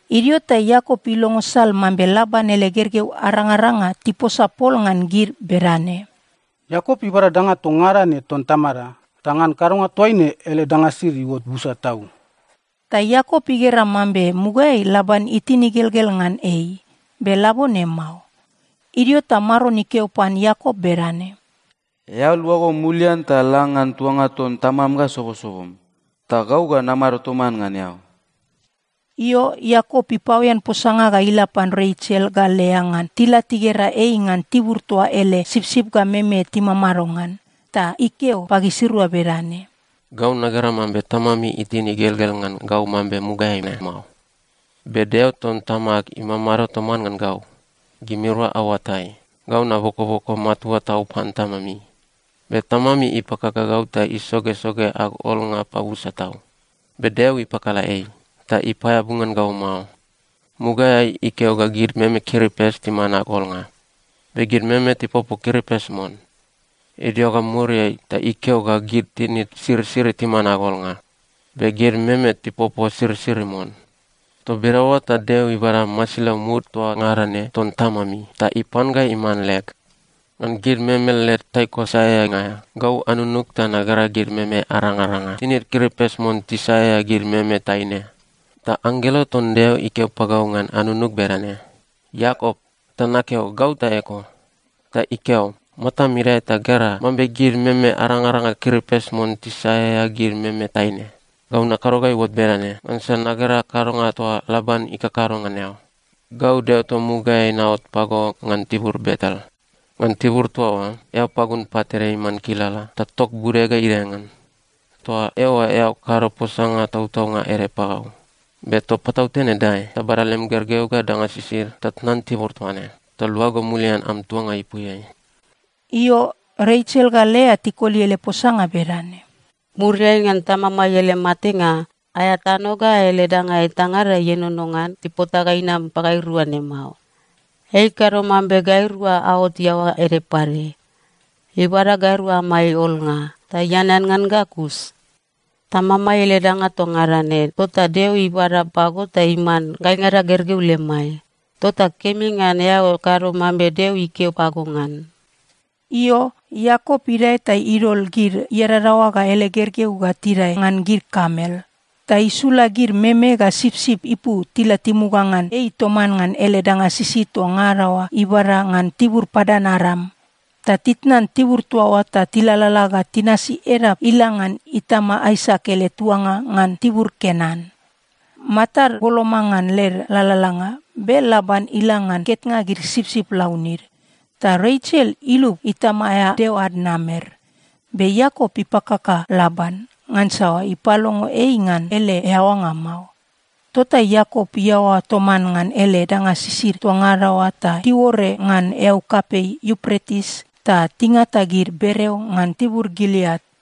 Idio ta Iakop ilongo sal mambe Laban ele gergeu arangaranga tiposa pol ngan gid bedane, “Iakop ibada danga toa ngada ne ton tamada, ta ngan kadonga toaine ele danga sisid iuot busa tau.” Ta Iakop igera mambe mugaeai Laban itin igelgel ngan ei, be labone mao. Idio ta Maron ikeo pan Iakop bedane, “Eao luago mulian ta la ngan tuanga ton tamam ga sobosobom. Ta gau ga namado toman ngan eao.” Io, Iakop ipaoen posanga ga ila pan Resel ga Lea ngan tila tigera ei ngan tibur toa ele sipsip ga meme timamado ngan. Ta ikeo pagisirua bedane, “Gau nagera mambe tamami itin igelgel ngan gau mambe mugaeai ne mao. Be Deo ton tamag imamado toman ngan gau. Gimirua aoatai, gau nabokoboko matua tau pan tamami. Be tamami ipakaka gau ta isogesoge ag olnga pabusa tau. Be Deo ipakala ei, ta ipaeabu ngan gau mao. Mugaeai ikeo ga gid meme kiripes timan ag olnga, be gid meme tipopo kiripes mon. Idio ga muriai ta ikeo ga gid tinid sirisiri timan ag olnga, be gid meme tipopo sirisiri mon. Toa bedaoa ta Deo ibada masilau mud toa ngada ne ton tamami ta ipan ga iman leg. “Ngan gid meme led taiko saeaeanga aea, gau anunug ta nagera gid meme arangaranga tinid kiripes mon tisaeaea gid meme taine. Ta anggelo ton Deo ikeo pagau ngan anunug bedane, ‘Iakop.’ Ta nakeo, ‘Gau ta eko.’ Ta ikeo, ‘Matam idae ta gera mambe gid meme arangaranga kiripes mon tisaeaea gid meme taine. Gau nakado ga iuot bedane, ngansa nagera kadonga toa Laban ikakado ngan eao. Gau Deo toa mugaeai naot pago ngan tibur Betel. Ngan tibur toa oa eao pagun pat ede iman kilala ta tok bude ga idae ngan. Toa eoa eao kado posanga tautaunga ede pagau. Be toa patautene dae ta bada lem gergeu ga danga sisid ta tnan tibur toa ne, ta luago mulian am tuanga ipuiai.’” Io, Resel ga Lea tikoli ele posanga bedane, “Muriai ngan tamamai ele matenga, aea tano ga ele danga etangada ienono ngan tipota ga inam pagairua ne mao. Ei ikado mambe gairua aot iaoa ede pade. Ibada gairua amai olnga, ta ianean ngan ga kus. Tamamai ele danga toa ngada ne, tota Deo ibada pago ta iman gaingada gergeu lemai. Tota kemi ngan eao kado mambe Deo ikeo pago ngan.” Io, Iakop idae ta idol gid iadadaoa ga ele gergeu ga tidae ngan gid kamel, ta isula gid meme ga sipsip ipu tila timuga ngan ei toman ngan ele danga sisid toa ngada oa ibada ngan tibur Padan-Aram. Ta titnan tibur toa oa ta tilalala ga tinasi edap ila ngan itama Aisak ele tuanga ngan tibur Kenan. Matad boloma ngan led lalalanga, be Laban ila ngan ketnga gid sipsip launid. Ta Resel ilub itama aea deo ad namer. Be Iakop ipakaka Laban, ngansa ipalongo ei ngan ele eaoanga mao. Tota Iakop iaoa toman ngan ele danga sisid toa ngada oa, ta tiuore ngan eau kapei Iupretis ta tingata gid bereo ngan tibur Gileat.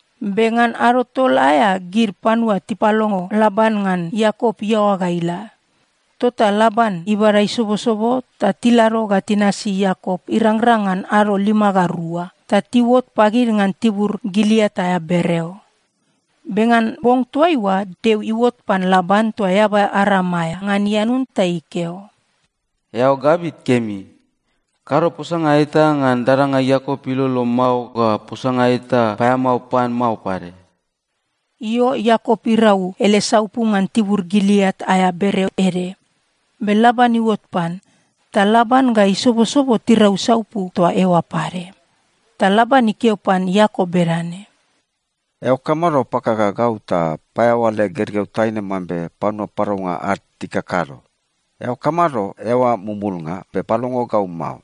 Be ngan ado tol aea gid panua tipalongo Laban ngan Iakop iaoa ga ila. Tota Laban ibada isobosobo ta tilado ga tinasi Iakop irangrang ngan ado lima ga rua. Ta tiuot pagid ngan tibur Gileat aea bereo. Be ngan bong toaiua Deo iuot pan Laban toa eaba Aram aea, ngan ianun ta ikeo, “Eao gabit kemi. Kado posanga eta ngan dadanga Iakop ilolo mao ga posanga eta paeamao pan mao pade.” Io, Iakop irau ele saupu ngan tibur Gileat aea bereo ede, be Laban iuot pan. Ta Laban ga isobosobo tirau saupu toa eoa pade. Ta Laban ikeo pan Iakop bedane, “Eao kamado pakaka gau ta paeaoa leg gergeu taine mambe panua paraunga ad tikakado? Eao kamado eaoa mumulnga, be palongo gau mao?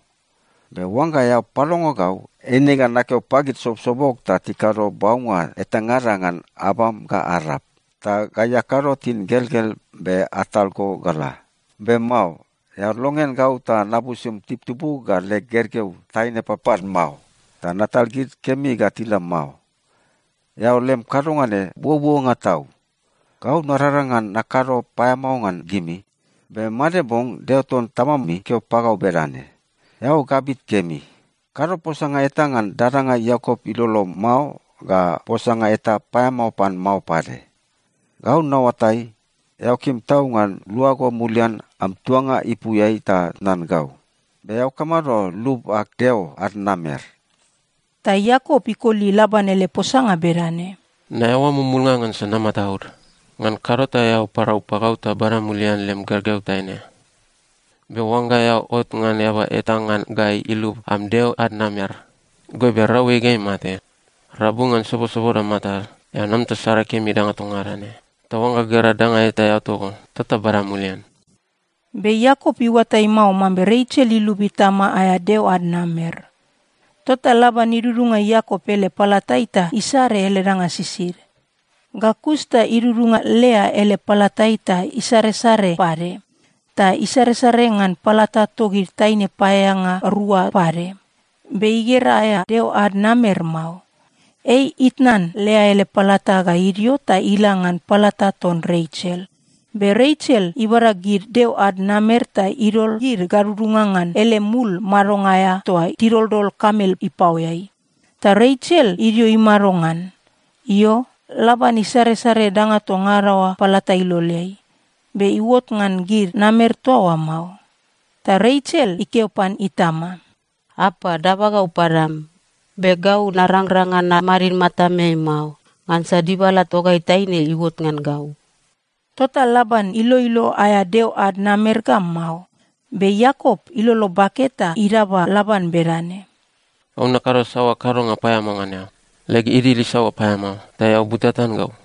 Be oangga eao palongo gau, eine ga nakeo pagid sobosobog ta tikado baunga etangada ngan abam ga arp, ta gai akado tingelgel be atal go ga la. Be mao. Eao longean gau ta nabusum tibutibug ga leg gergeu taine papad mao, ta natal gid kemi ga tila mao. Eao lem kadonga ne buobuonga tau. Gau narangrang ngan nakado paeamao ngan gimi, be made bong Deo ton tamami ikeo pagau bedane, ‘Eao gabit kemi. Kado posanga eta ngan dadanga Iakop ilolo mao ga posanga eta paeamao pan mao pade.’ Gau naoatai, eao kim tau ngan luago mulian am tuanga ipuiai ta tnan gau. Be eao kamado lub ag deo ad namer?” Ta Iakop ikoli Laban ele posanga bedane, “Naeaoa mumulnga ngansa namataud. Ngan kado ta eao parau pagau ta bada mulian lem gergeu taine. Be oangga eao ot ngan eaba eta ngan gai ilub am deo ad namer, goibe rau ei ga imate. Rabu ngan sobosoboda matad, eao nam ta sare kemi danga toa ngada ne. Ta oangga gera danga eta eao togo, tota bada mulian.” Be Iakop iuatai mao mambe Resel ilub itama aea deo ad namer. Tota Laban idudunga Iakop ele palatai ta isare ele danga sisid. Ga kus ta idudunga Lea ele palatai ta isaresare pade. Ta isaresare ngan palata togid taine paeaeanga rua pade. Be igera aea deo ad namer mao. Ei itnan Lea ele palata ga idio ta ila ngan palata ton Resel. Be Resel ibada gid deo ad namer ta idol gid gadudunga ngan ele mul madonga aea toa tidoldol kamel ipaoeai. Ta Resel idio imado ngan. Io, Laban isaresare danga toa ngada oa palata iloleai, be iuot ngan gid namer toa oa mao. Ta Resel ikeo pan itama, “Apa, daba gau padam, be gau narangrang ngan namadid matameai mao, ngansa dibala togai taine iuot ngan gau.” Tota Laban iloilo aea deo ad namer ga mao. Be Iakop ilolo bake ta idaba Laban bedane, “Gau nakado saoa kadonga paeamao ngan eao? Leg idil isaoa paeamao ta eao butatan gau?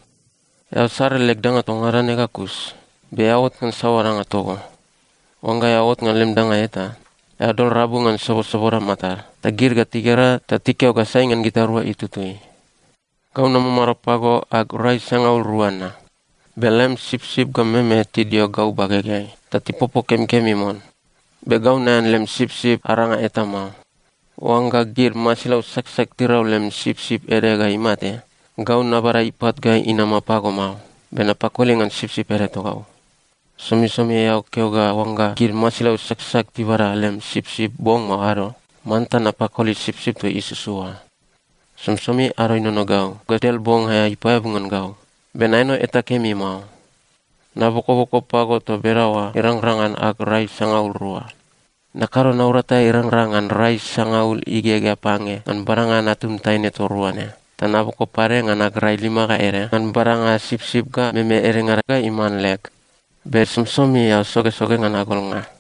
Eao sare leg danga toa ngada ne ga kus, be eao ot ngan saoa danga togo? Oangga eao ot ngan lem danga eta, eao dol rabu ngan sobosoboda matad. Ta gid ga tigera ta tikeo ga sai ngan gitarua itutui. “Gau namamado pago ag rai sangaul rua na. Be lem sipsip ga meme tidio gau bagegeai ta tipopo kemikemi mon. Be gau naean lem sipsip aranga eta mao. Oangga gid masilau saksak tirau lem sipsip ede ga imate, gau nabada ipat ga inama pago mao, be napakoli ngan sipsip ede togau. Somisomi eao keo ga oangga gid masilau saksak tibada lem sipsip bong mao ado, manta napakoli sipsip toa isusu oa. Somisomi ado inono gau ga del bong aea ipaeabu ngan gau. Be naeno eta kemi mao. Nabokoboko pago toa bedaoa irangrang ngan ag rai sangaul rua. Nakado naurata irangrang ngan rai sangaul igegea pange ngan badanga natum taine toa rua ne, ta naboko pade ngan ag rai lima ga ede ngan badanga sipsip ga meme edengada ga iman leg. Be somisomi eao sogesoge ngan ag olnga.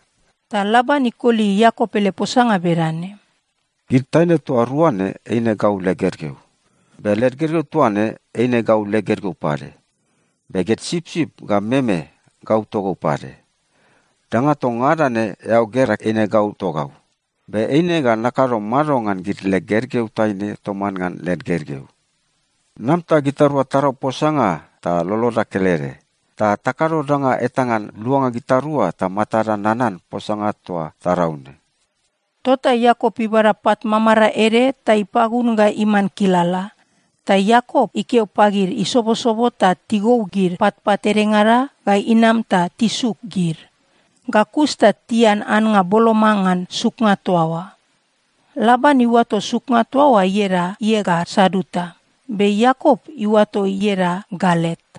Ta Laban ikoli Iakop ele posanga bedane, “Gid taine toa rua ne eine gau leg gergeu. Be led gergeu toa ne eine gau leg gergeu pade. Be gid sipsip ga meme, gau togau pade. Danga toa ngada ne eao gera, eine gau togau. Be eine ga nakado mado ngan gid leg gergeu taine toman ngan led gergeu? Nam ta gitarua tarau posanga ta loloda kelede. Ta takado danga eta ngan luanga gitarua ta matada nanan posanga toa tarau ne.” Tota Iakop ibada pat mamarae ede ta ipagun ga iman kilala. Ta Iakop ikeo pagid isobosobo ta tigou gid patpat edengada ga inam ta tisuk gid. Ga kus ta tian annga boloma ngan suknga toa oa. Laban iuato suknga toa oa ieda Iegar-Saaduta, be Iakop iuato ieda Galet.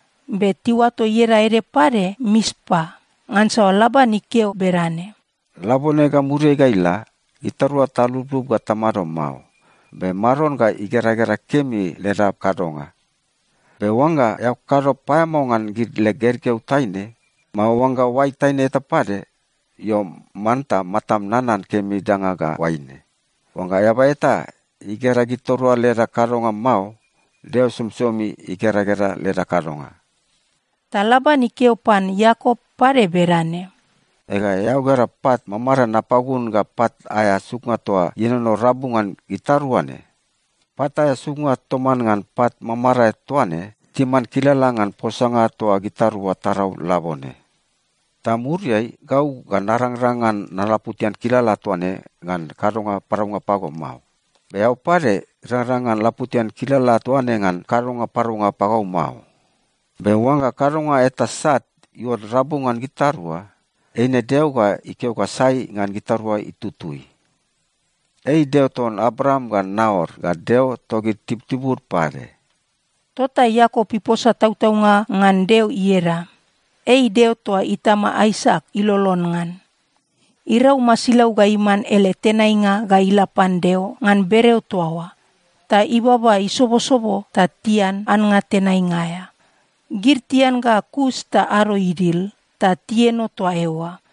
Be tiuato ieda ede pade Mispa, ngansa Laban ikeo bedane, “Labone ga muriai ga ila, gitarua taluplup ga tamado mao, be Maron ga igeragera kemi leda kadonga. Be oangga eao kado paeamao ngan gid leg gergeu taine, mao oangga oai taine eta pade, io, manta matam nanan kemi danga ga oaine: Oangga eaba eta igera gitarua leda kadonga mao, Deo somisomi igeragera leda kadonga.” Ta Laban ikeo pan Iakop pade bedane, “Ega, eao gera pat mamarae napagun ga pat aea suknga toa ienono rabu ngan gitarua ne. Pat aea suknga toman ngan pat mamarae toa ne timan kilala ngan posanga toa gitarua tarau labone. Ta muriai, gau ga narangrang ngan nalaputian kilala toa ne ngan kadonga paraunga pago mao. Be eao pade rangrang ngan laputian kilala toa ne ngan kadonga paraunga pagau mao. Be oangga kadonga eta sat iuot rabu ngan gitarua, eine Deo ga ikeo ga sai ngan gitarua itutui. Ei Deo ton Abraam ga Naor ga Deo togid tibutibud pade.” Tota Iakop iposa tautaunga ngan Deo ieda. Ei Deo toa itama Aisak ilolon ngan. Irau masilau ga iman ele tenainga ga ila pan Deo ngan bereo toa oa, ta ibaba isobosobo ta tian annga tenainga aea. Gid tian ga kus ta ado idil, ta tieno toa eoa.